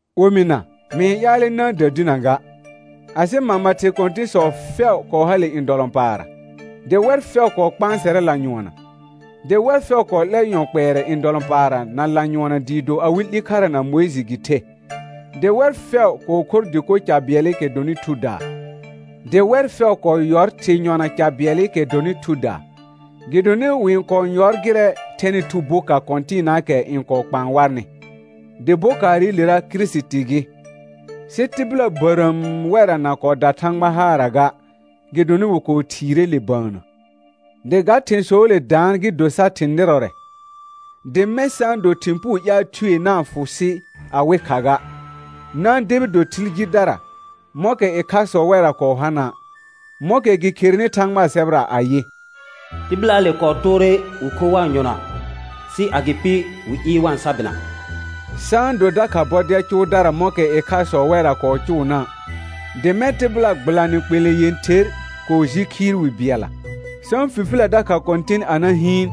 Omɩna, mɩ-n ƴaalɛ na-n dədinə ga, asɩ mama thɩ kɔ̃tɩ̃sɔ fɛʋ kɔɔ hale ndɔlɔ̃paarra, dɩ wɛr fɛʋ kɔɔ kpãsɛrɛ lanyʋɔnna; dɩ wɛr fɛʋ kɔɔ 'lɛr yɔ kpɛɛrɛ ndɔlɔ̃paarra na lanyʋɔnna dɩɩ do awɩ 'li khara na Mʋɩjɩ gɩ the; dɩ wɛr fɛʋ kɔɔ khor dɩko ca bɩɛlɩkɛ dɔnɩ thudaa, dɩ wɛr fɛʋ kɔɔ yɔr thɩ̃ yɔna ca bɩɛlɩkɛ dɔnɩ thudaa. Gɩdonɩ wɩ-n kɔɔ yɔr gɩrɛ thɛnɩ thu boka kɔ̃tɩɩnaakɛ n kɔɔ kpaan warnɩ, dɩ bokaarɩlera Kirisiti gɩ. Sɩ tɩbɩla bərəəm wɛrra na kɔɔ da Thãgba haarra ga, gɩdonɩ wɩ kɔɔ thiire le bəənnə. Dɩ ga thɩ̃sɔɔle daan gɩ do sar thɩ̃ nɩrɔrɛ, dɩ mɛ̃ sa-n do thɩ̃ puu ƴaal thue na-n fʋ sɩ awɩ kha ga. Na-n debi do thɩl jidara, mɔ̃kɛ ɩkhasɔ wɛrra kɔɔ hana', mɔ̃kɛ gɩ kherenɩ Thãgbaa sɛbɛra ayɩ: «Tɩbɩlaale kɔɔ toore wɩ kho wa-n yɔna, sɩ agɩpɩ wɩ ɩɩr wa-n sa bɩna.» Sa-n do dakha bɔdɛl cʋʋdara mɔ̃kɛ ɩkhasɔ wɛrra kɔɔ cʋʋna', dɩ mɛ̃ tɩbɩla gbɩlanɩ kpelẽ yẽther kɔɔ ji khiir wi bɩɛlla. Sa-n fifilə dakha Kɔ̃tɩn a na hɩɩn,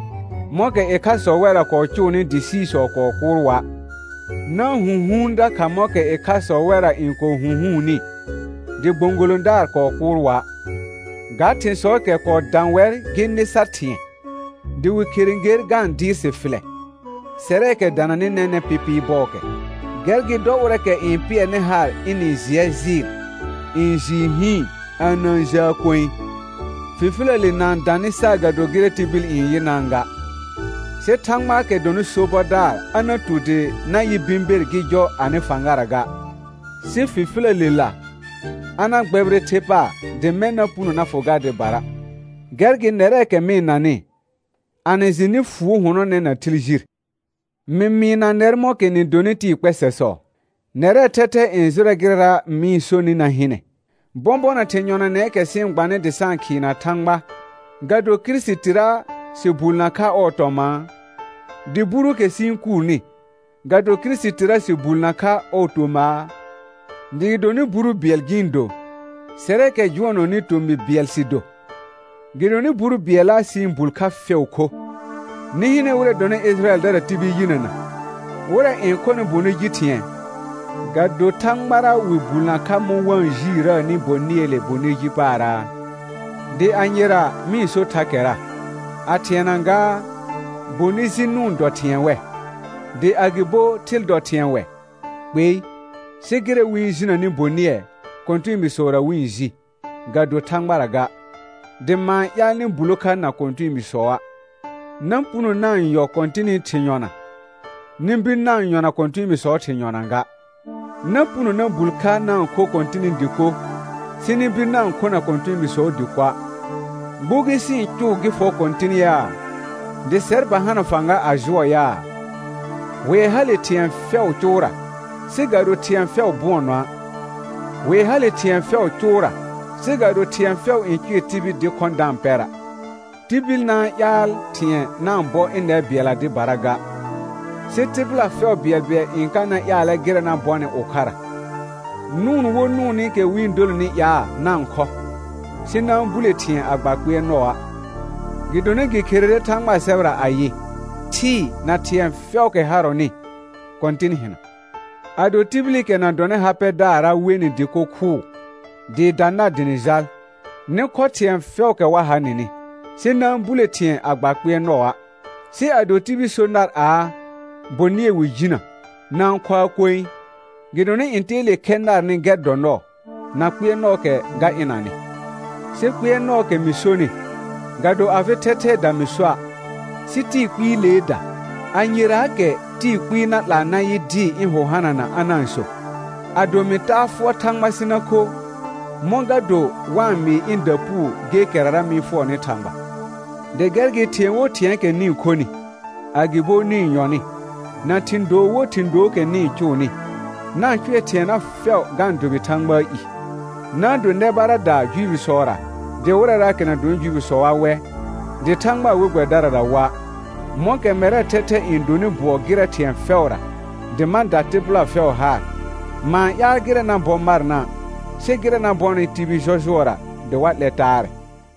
mɔ̃kɛ ɩkhasɔ wɛrra kɔɔ cʋʋnɩ dɩ siisɔ kɔɔ kʋʋr wa'. Na-n hũhuun dakha mɔ̃kɛ ɩkhasɔ wɛrra n kɔɔ hũhuunni, dɩ gbõgolõdaar kɔɔ kʋʋr wa'. Ga thɩ̃sɔɔkɛ kɔɔ dã wɛr gɩ nɩ sar thɩ̃ɛ, dɩ wɩ khere ger ga-n dɩɩr sɩ fɩlɛ, sɛrɛɛkɛ dananɩ nɛnɛ̃ pɩpɩɩ bɔɔkɛ. Gɛr gɩ dɔ ʋrɛɛkɛ n pɩɛrnɩ haar ɩnɩ jɩɛ jɩɩl, n jɩɩ hɩɩn, a na-n jəə koe. Fifiləle na-n dã nɩ saagado gɩrɛ tibil n yɩnaa ga; sɩ Thãgbaakɛ dɔnɩ sobɔdaar a na tu dɩ na yɩ bɩ̃ ber gɩ jɔ anɩ fãgara ga, sɩ fifiləlela a na gbɛbɩrɛ the paar dɩ mɛ̃ na puno na fʋ gar dɩbara. Gɛr gɩ nɛrɛɛkɛ mɩ-n nanɩ, a nɩ jɩ nɩ fuo hʋnɔnɛ na thɩl jir. Mɩ mɩɩna nɛr mɔ̃kɛ nɩ donɩ tɩɩ kpɛsɛsɔ; nɛrɛɛ thɛthɛ n jʋrɛ gɩrɛra mɩ-n sonɩ na hɩnɛ. Bɔ̃bɔna thɩ̃ yɔnanɛɛkɛ sɩ-n gbanɩ dɩ sa-n khɩɩna Thãgba, ga do Kirisitira sɩ bulnə kha ɔɔ tɔmãa? Dɩ buruukɛ sɩ-n kuurni, ga do Kirisitira sɩ bulnə kha ɔɔ tomaa? Dɩ gɩdonɩ buru bɩɛl gɩ-n do, sɛrɛɛkɛ jʋɔnɔnɩ tomɩ bɩɛl sɩ do, gɩdonɩ buru bɩɛlla sɩ-n bul kha fɛʋ kho. Nɩ hɩnɛ wɩrɛ dɔnɩ Ɩjɩrayɛldara tibil yinəna: Wɩrɛ n khɔnɩ bonɩ ji thɩ̃ɛ, ga do Thãgbara wɩ bulnə kha mɔ̃ wa-n jiirəəni bonɩɛɛle bonɩ ji paaraa? Dɩ anyera mɩ-n so thakɛra? A thɩɛna gaa, bonɩ ji nʋʋn dɔ thɩ̃ɛ wɛ? Dɩ agɩbo thɩl dɔ thɩ̃ɛ wɛ? Kpei. Sɩ gɩrɛ wɩ-n jinəni bonɩɛ, kɔ̃tɛɛbiisɔra wɩ-n ji, ga do Thãgbara ga, dɩ ma-n ƴaal nɩ bulo kha na kɔ̃tɛɛbiisɔa'. Na puno na-n yɔ Kɔ̃tɩnɩ thɩ̃ yɔna, nɩ bir na-n yɔna kɔ̃tɛɛbiisɔɔ thɩ̃ yɔna ga; na puno na bul kha na-n kho Kɔ̃tɩnɩ dɩko, sɩ nɩ bir na-n khona kɔ̃tɛɛbiisɔɔ dɩkoa'. Gbugi sɩ-n cʋʋ gɩ fɔ Kɔ̃tɩn yaa? Dɩ sɛr ba hana fãga a jʋɔ yaa? Hʋɛ hale thɩ̃ɛ fɛʋʋ cʋʋra, sɩ ga do thɩ̃ɛ fɛʋ bʋɔnɔa'. Hʋɛ hale thɩ̃ɛ fɛʋʋ cʋʋra, sɩ ga do thɩ̃ɛ fɛʋ n cʋɛ tibil dɩ khɔ̃ da-n pɛra'. Tibil na-n ƴaal thɩ̃ɛ na-n bɔ ɩnɛr bɩɛlla dɩbara ga, sɩ tɩbɩla fɛʋ bɩɛlbɩɛl n ka na ƴaalɛ gɩrɛ na bɔnɩ ʋkhara. Nʋʋn wo nʋʋnɩkɛ wɩ-n dolonɩ ƴaa na-n khɔ, sɩ na-n bule thɩ̃ɛ a gba kpɩɛrnɔa'; gɩdonɩ gɩ kherere Thãgbaa sɛbɛra ayɩ: «Thɩɩ na thɩ̃ɛ fɛʋʋkɛ harɔnɩ, Kɔ̃tɩn hɩna.» Ado tibilikɛ na dɔnɩ ha pɛdaara' we nɩ dɩko khʋʋ, dɩɩ da nar dɩ nɩ jal, nɩ khɔ thɩ̃ɛ fɛʋʋkɛ wa ha nɩnɩ, sɩ na-n bule thɩ̃ɛ a gba kpɩɛrnɔa'. Sɩ ado tibil so nar aa: Bonɩɛ wɩ jinə; na-n khoa koe, gɩdonɩ ntɛɛle khɛ narnɩ gɛr dɔ nɔɔ, na kpɩɛrnɔɔkɛ ga ɩnanɩ. Sɩ kpɩɛrnɔɔkɛ mɩ sonɩ, ga do afɩ thɛthɛɛda mɩ soa', sɩ tɩɩ kpɩɩleeda. Anyeraakɛ tɩɩ kpɩɩ na 'laa na yɩ dɩɩ ɩ̃ hʋ hanana a na-n so. Ado mɩ taa fʋɔr Thãgba sɩ na kho, mɔ̃ ga do wa-n mɩɩ ɩ̃da puu gekɛrara mɩ-n fʋɔrɔnɩ Thãgba? Dɩ gɛr gɩ thɩ̃ɛ wo thɩ̃ɛɛkɛ nɩ-n khonɩ, agɩbo nɩ-n yɔnɩ, na thɩ̃ doo wo thɩ̃ dookɛ nɩ-n cʋʋnɩ, na-n cʋɛ thɩɛna fɛʋ ga-n dʋbɩ Thãgbaa i. Na-n do nɛ baradaa Juifisɔra, dɩ wɩrɛraakɛ na dɔnɩ Juifisɔa wɛ, dɩ Thãgbaa we gbɛbɩdarara wa'; mɔ̃kɛ mɛrɛɛ thɛthɛ n donɩ bʋɔ gɩrɛ thɩ̃ɛ fɛʋra, dɩ ma da tɩbɩla fɛʋ haar; ma-n ƴaal gɩrɛ na bɔ marna', sɩ gɩrɛ na bɔnɩ tibil jɔjʋɔra dɩ wa 'lɛ taarɛ.